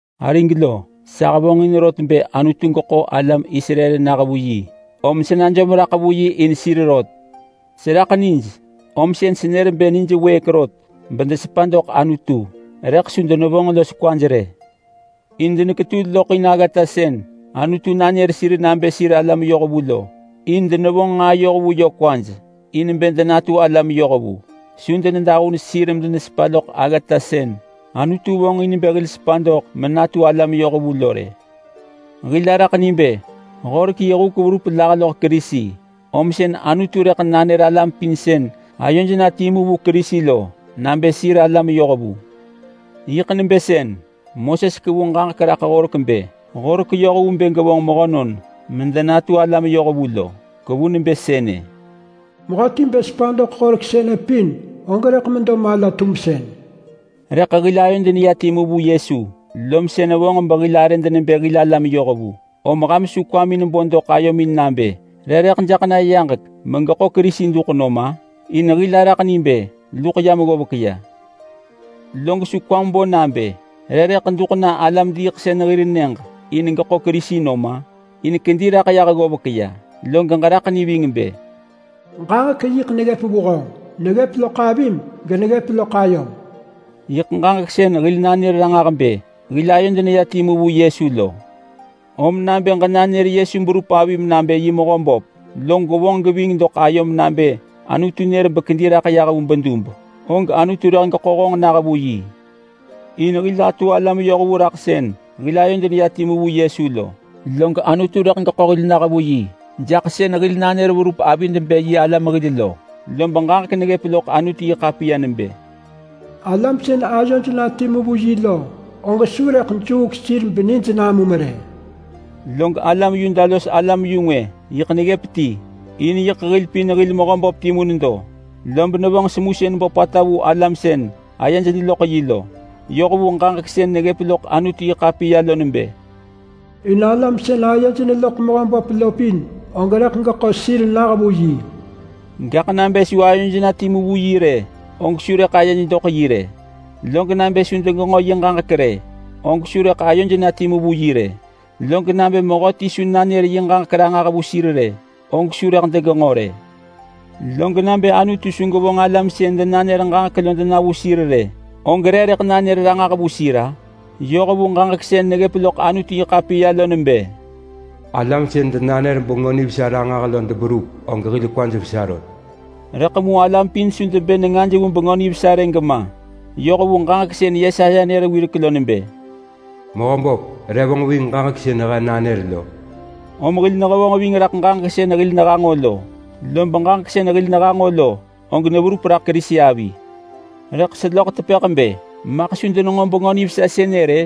Arig lo, sa hevonġin rot bë Anutu geḳo alam Israel nah vu yi, om sa najom raḳ vu yi in sir rot. Seraḳ nij, om sën senër bë nij wëëk rot bë desepa doḳ Anutu. Rëḳ su denevonġ los kwaj rë. In deneketul loḳ in aggata sën Anutu nanër sir nabë sir alam yohvu lo, in denevonġ nġaa yoh vu yö kwaj in bë denatu alam yohvu. Su denedahun sir medenesepa loḳ aggata sën Anutu vonġ in bë hil sepa doḳ menatu alam yohvu lo rë. Hil araḳ ni bë Horek yi huk verup lah loḳ Kerisi, om sën Anutu rëḳ nanër alam pin sën ayoj na timu vu Kerisi lo nabë sir alam yohvu. Yiḳ nebë sën Moses kevu ġaġek raḳ Horek bë: Horek yoh vu bë gevonġ mehönon medenatu alam yohvu lo. Kevu nebë sënë, “Mehöti bë sepa doḳ horek sënë pin, og rëḳ medo mala-tumsën.” Rëḳ mu hil ayod neya timu vu Yesu, lom sën vonġ behil arëd nebë hil alam yohvu, om ham su kwamin bo doḳ ayomin nabë, “Re rëḳ doḳ na yaġek, megeḳo Kerisi duḳ nam-a?” In hil araḳ ni bë luḳ yam ggovek ya. Log su kwam bo nabë, “Re rëḳ duḳ na alam-diiḳsën hir nyëġ in geḳo Kerisi nom-a?” Gaḳ kedi raḳ yah ggovek ya. Log ġeraḳ ni ving bë, “Ġaġek yiḳ neggëp vu honġ. Neggëp loḳ avim geneggëp loḳ ayom.” Yiḳ ġaġek sën hil nanër ranġah bë hil ayod neya timu vu Yesu lo. Om nabë ġenanër Yesu berup avim nabë yi Mehöböp, log gwevonġ geving doḳ ayom nabë Anutu nër bekedi raḳ yah vu bedub, og Anutu rëḳ geḳo honġ nah vu yi. In hil atu alam yohvu raḳ sën hil ayod neya timu vu Yesu lo, log Anutu rëḳ geḳo hil nah vu yi jaḳ sën hil nanër verup avid bë yi alam hil lo. Lob ġaġek neggëp loḳ Anutu-yi-ḳapiya nebë, “Alam sën ayoj na timu vu yi lo, og su rëḳ juuk sir benij namum rë.” Log alam Yuda los alam-yu-ngwë neggëp timu in yiḳ hil pin hil Mehöböp timu nedo, lob nevonġ semusën böpata vu alam sën ayej neloḳ yi lo. Yoh vu sën neggëp loḳ Anutu-yi-ḳapiya lo nebë, “In alam sën ayej neloḳ Mehöböp lo pin, og rëḳ geḳo sir nah vu yi.” Rëḳ nabë su ayoj na timu vu yi rë, og su rëḳ ayej doḳ yi rë. Log nabë su degenġo yi ġaġek rë, og su rëḳ ayoj na timu vu yi rë. Log nabë mehöti su nanër yi ġaġek ranġah vu sir rë, og su rëḳ degenġo rë. Log nabë Anutu su gevonġ alam sën denanër ġaġek lo dena vu sir rë, og re rëḳ nanër ranġah vu sir-a? Yoh vu ġaġek sën neggëp loḳ Anutu-yi-ḳapiya lo nebë, “Alam sën denanër Bengö Nivesa ranġah lo deberup, og hil kwad vesa rot.” Rëḳ mu alam pin su debë nengaj vu Bengö Nivesa rë gema. Yoh vu sën Yesaya nër wirek lo nebë, “Mehöböp, re vonġ ving ġaġek sën he nanër lo?” Om hil nehevonġ ving raḳ ġaġek sën hil nehanġo lo, lob ġaġek sën hil nehanġo lo, og neverup raḳ Kerisi avi. Rëḳ seloḳ tepëḳ bë: Maḳ su denenġo Bengö Nivesa sënë rë?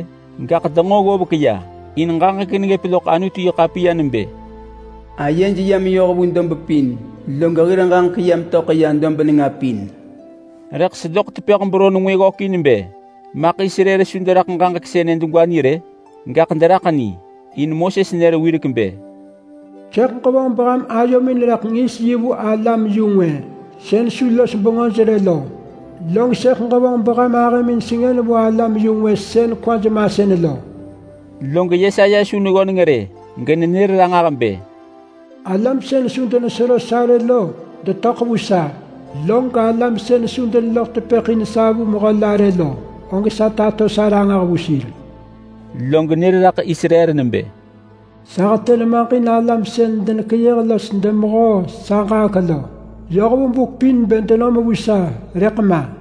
Gaḳ denġo ggovek ya. In ġaġek neggëp loḳ Anutu-yi-ḳapiya nebë: “Ayej ya meyoh vu dob pin. Log hir ġaġek ya metöḳ ya dob nenga pin.” Rëḳ seloḳ tepëḳ beron ngwë ggökin bë: Maḳ Israel su deraḳ ġaġek sënë degwa ni rë? Gaḳ deraḳ ni in Moses nër wirek bë: “Sëḳ ġevonġ beham ayomin rëḳ ngis yi in alam-yu-ngwë sën su los bengöj rë lo, log sëḳ ġevonġ beham ahëmin sengën vu alam-yu-ngwë sën kwaj masën lo.” Rëḳ Yesaya su neggöneng rë genenër ranġah bë: “Alam sën su denesero sa rë lo detöḳ vu sa, log alam sën su deneloḳ tepëḳ in sa vu mehö la rë lo, og sa tato sa ranġah vu sir.” Lob nër raḳ Israel nebë: “Sa hetë nemaġ in alam sën denekeyëh los demehoo sa ġaġek lo yoh vu buk pin bë denom vu sa, rëḳ ma.”